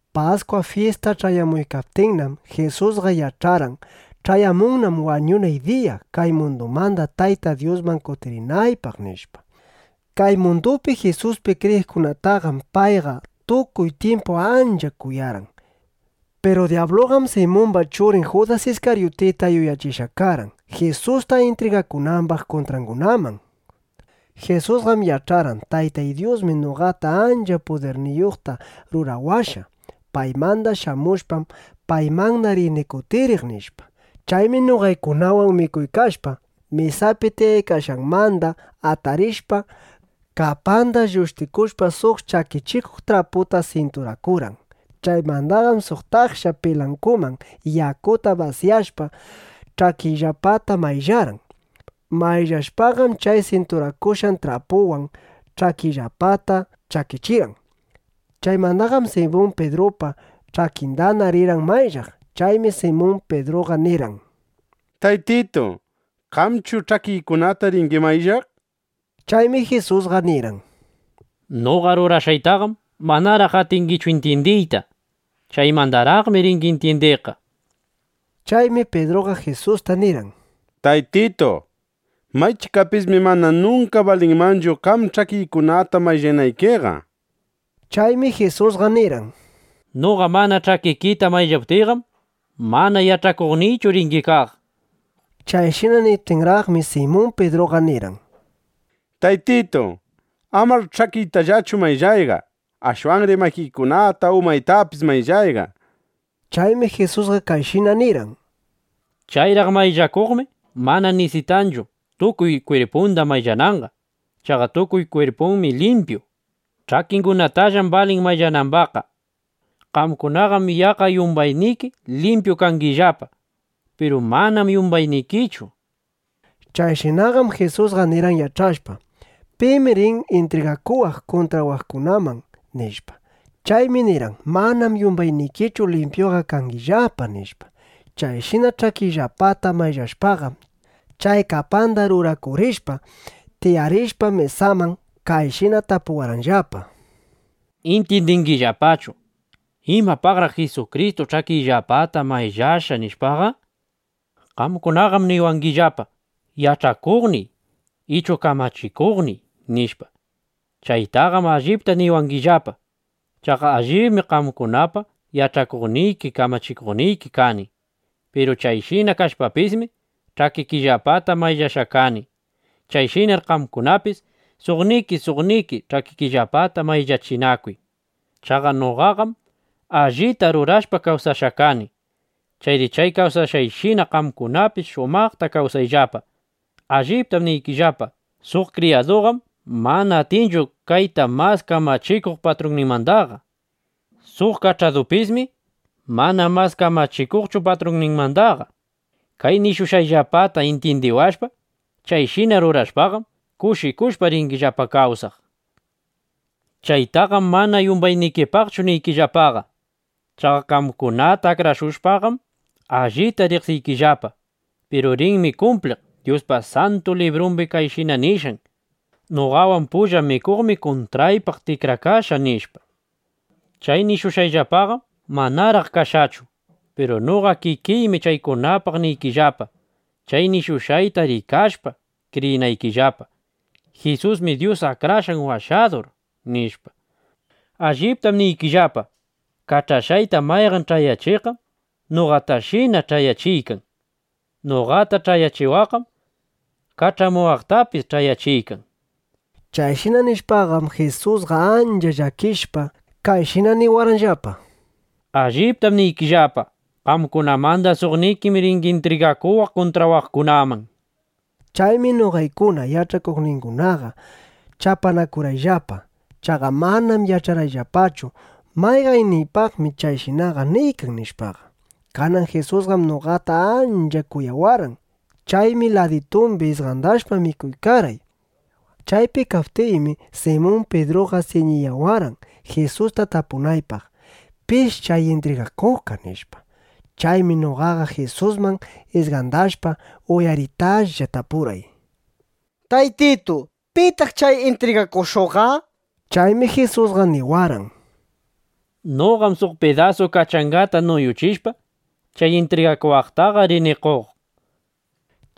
Paskwa fyista ch'ayamuykaptinnam, Jisusqa yach'arqan: Ch'ayamunnam wañunay diya, kay mundumanda Tayta Dyusman kutirinaypaq, nishpa. Kay mundupi Jisuspi kriyiqkunataqam payqa tukuy tyimpu ancha kuyarqan. Piru dyabluqam Simumba churin Judas Iskaryutita yuyachishqa karqan, Jisusta intrigakunambaq kuntraqkunaman. Jisusqam yach'arqan: Taytay Dyusmi noqata ancha pudirniyuqta rurawashqa. Paymanda shamushpam, paymanna rini kutiriq, nishpa. Chaymi noqaykunawan mikuykashpa, mesapi tiyaykashqanmanda atarishpa, kapanda llushtikushpa, suq chakichikuq traputa sinturakurqan. Chaymandaqam suq taksha pilankuman yakuta basyashpa, ch'akiyllapata mayllarqan. Mayllashpaqam, chay sinturakushqan trapuwan ch'akiyllapata chakichirqan. Chaymandaqam Simun Pidrupa ch'akindana rirqan mayllaq. Chaymi Simun Pidruqa nirqan: —Taytitu, ¿qamchu ch'akiykunata ringi mayllaq? nishpa. Chaymi Jisusqa nirqan: —Noqa rurashqaytaqam manaraq atingichu intyindiyta. Chaymandaraqmi ringi intyindiqqa, nishpa. Chaymi Pidruqa Jisusta nirqan: —Taytitu, maychikapismi mana nunka balinmanchu, qam ch'akiykunata mayllanaykiqa, nishpa. Chaymi Jisusqa nirqan: —Noqa mana ch'akikita mayllaptiyqam, mana yach'akuqniychu ringi kaq, nishpa. Chayshina niptinraqmi, Simun Pidruqa nirqan: —Taytitu, amar ch'akiytallachu mayllayqa. Ashwanri makiykunata, umaytapis mayllayqa, nishpa. Chaymi Jisusqa kayshina nirqan: —Chayraq mayllakuqmi mana nisitanchu, tukuy kwirpunda mayllananqa. Chaqa tukuy kwirpunmi limpyu. Ch'akingunatallam balin mayllanambaqqa. Qamkunaqam yaqqa yumbayniki limpyu kangillapa; piru manam yumbaynikichu, nishpa. Chayshinaqam Jisusqa nirqan, yach'ashpa: Pim rin intrigakuwaq kuntrawaqkunaman, nishpa. Chaymi nirqan “Manam yumbaynikichu limpyuqa kangillapa”, nishpa. Chayshina ch'akiyllapata mayllashpaqam, chay kapanda rurakurishpa, tiyarishpa mesaman, kayshina tapuwarqanllapa: —¿Intyindingillapachu: Imapaqraq Jisukristu ch'akiyllapata mayllashqa, nishpaqa? Qamkunaqam niwangillapa: “Yach'achikuqniy” ichu “Kamachikuqniy”, nishpa. Chaytaqam allipta niwangillapa. Chaqa allibmi qamkunapa yach'achikuqniki, kamachikuqniki kani. Piru chayshina kashpapismi, ch'akikillapata mayllashqa kani. Chayshinar qamkunapis suqniki suqniki ch'akikillapata mayllachinakuy. Chaqa noqaqam allita rurashpa, kawsashqa kani. Chayri chay kawsashqayshina, qamkunapis shumaqta kawsayllapa. Alliptam niykillapa, suq kriyaduqam mana atinchu kayta mas kamachikuq patrunninmandaqa. Suq kach'adupismi mana mas kamachikuqchu patrunninmandaqa. Kay nishushqayllapata intyindiwashpa, chayshina rurashpaqam, kushikushpa ringillapa kawsaq. ’Chaytaqam mana yumbaynikipaqchu niykillapaqa. Chaqa qamkunata akrashushpaqam, allita riqsiykillapa. Piru rinmi kumpliq Dyuspa Santu Librumbi kayshina nishqan: “Noqawan pulla mikuqmi kuntraypaq tikrakashqa”, nishpa. Chay nishushqayllapaqam manaraq kashqachu. Piru noqa kikiymi chaykunapaq niykillapa, chay nishushqayta rikashpa, kriyinaykillapa: Jisusmi Dyus Akrashqan Washadur, nishpa. Alliptam niykillapa, kach'ashqayta mayqan ch'ayachiqqam noqatashina ch'ayachiykan. Noqata ch'ayachiwaqqam kach'amuwaqtapis ch'ayachiykan, nishpa. Chayshina nishpaqam Jisusqa ancha llakishpa, kayshina niwarqanllapa: —Alliptam niykillapa, qamkunamanda suqnikim ringi intrigakuwaq kuntrawaqkunaman, nishpa. Chaymi noqaykuna yach'akuqningunaqa chapanakurqayllapa. Chaqa manam yach'arqayllapachu: ¿Mayqanniypaqmi chayshinaqa niykan? nishpaqa. Kanan Jisusqam noqata ancha kuyawarqan. Chaymi laditumbi isqandashpa, mikuykarqay. Chaypi kaykaptiymi, Simun Pidruqa siñiyawarqan, Jisusta tapunaypaq: ¿Pish chay intrigakuqqa? nishpa. Chaymi noqaqa Jisusman isqandashpa, uyaritaplla tapurqay: —Taytitu, ¿pitaq chay intrigakushuqqa? nishpa. Chaymi Jisusqa niwarqan: —Noqam suq pidasu kachangata nuyuchishpa, chay intrigakuwaqtaqa rini qoq, nishpa.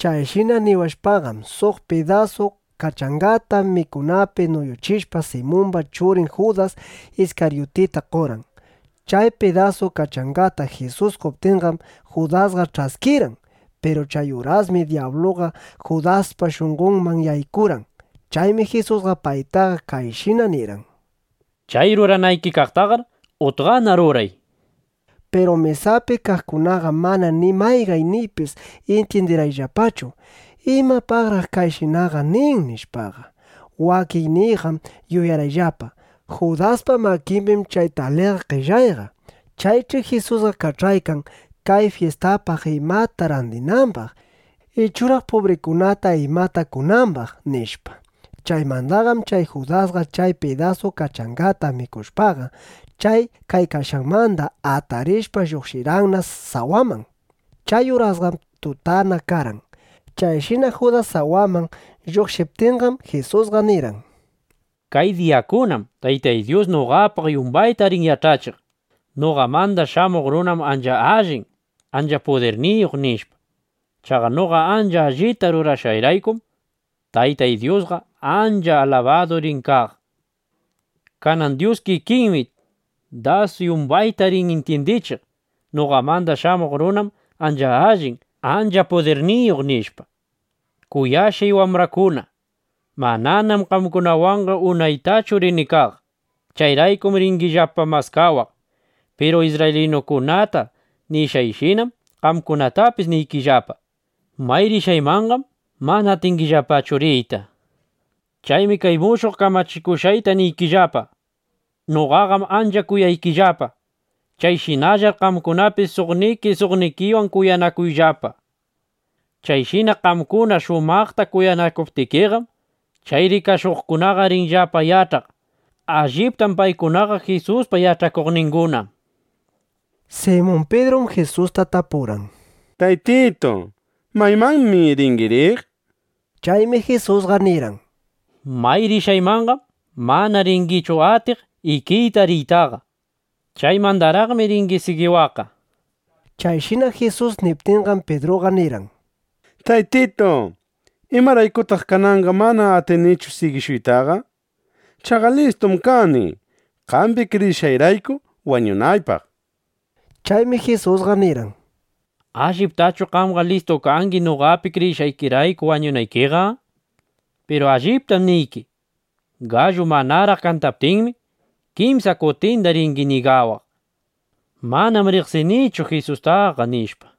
Chayshina niwashpaqam, suq pidasu kachangata mikunapi nuyuchishpa, Simumba churin Judas Iskaryutita qorqan. Chay pidasu kachangata Jisus qoptinqam, Judasqa ch'askirqan. Piru chay urasmi dyabluqa Judaspa shunqonman yaykurqan. Chaymi Jisusqa paytaqa kayshina nirqan: —Chay ruranayki kaqtaqar utqana ruray, nishpa. Piru mesapi kaqkunaqam mana ni mayqanniypis intyindirqayllapachu: ¿Imapaqraq kayshinaqa nin? nishpaqa. Wakinniyqam yuyarqayllapa: Judaspa makimbim chay taliga qellayqa. Chaych'i Jisusqa kach'aykan, kay fyistapaq imata randinambaq, ichuraq pubrikunata imata qonambaq, nishpa. Chaymandaqam chay Judasqa chay pidasu kachangata mikushpaqa, chay kaykashqanmanda atarishpa, lluqshirqanna sawaman. Chay urasqam tutana karqan. Chayshina Judas sawaman lluqshiptinqam, Jisusqa nirqan: —Kay diyakunam Tayta Dyus noqapaq yumbayta rin yach'achiq: Noqamanda Shamuq Runam ancha allin, ancha pudirniyuq, nishpa. Chaqa noqa ancha allita rurashqayraykum, Taytay Dyusqa ancha alabadu rin kaq. Kanan Dyus kikinmi das yumbayta rin intyindichiq: Noqamanda Shamuq Runam ancha allin, ancha pudirniyuq, nishpa. Kuyashqay wambraykuna, mananam qamkunawanqa unaytachu rini kaq. Chayraykum ringillapa maskawaq. Piru isrraylinukunata nishqayshinam, qamkunatapis niykillapa, may rishqaymanqam mana atingillapachu riyta, nishpa. Chaymi kay mushuq kamachikushqayta niykillapa: Noqaqam ancha kuyaykillapa. Chayshinallar qamkunapis suqniki suqnikiwan kuyanakuyllapa, nishpa. Chayshina qamkuna shumaqta kuyanakuptikiqam, chay rikashuqkunaqa rinllapa yach'aq: Alliptam paykunaqa Jisuspa yach'akuqninguna, nishpa. Simun Pidrum Jisusta tapurqan: —Taytitu, ¿maymanmi ringi riq? nishpa. Chaymi Jisusqa nirqan: —May rishqaymanqam mana ringichu atiq ikiyta riytaqa. Chaymandaraqmi ringi sigiwaqqa, nishpa. Chayshina Jisus niptinqam, Pidruqa nirqan: —Taytitu, ¿imaraykutaq kananqa mana atinichu sigishuytaqa? Chaqa listum kani, qambi kriyishqayrayku wañunaypaq, nishpa. Chaymi Jisusqa nirqan: —¿Alliptachu qamqa listu kangi noqapi kriyishqaykirayku wañunaykiqa? Piru alliptam niyki, gallu manaraq kantaptinmi, kimsa kutinda ringi ñigawaq: “Manam riqsinichu Jisustaqa”, nishpa.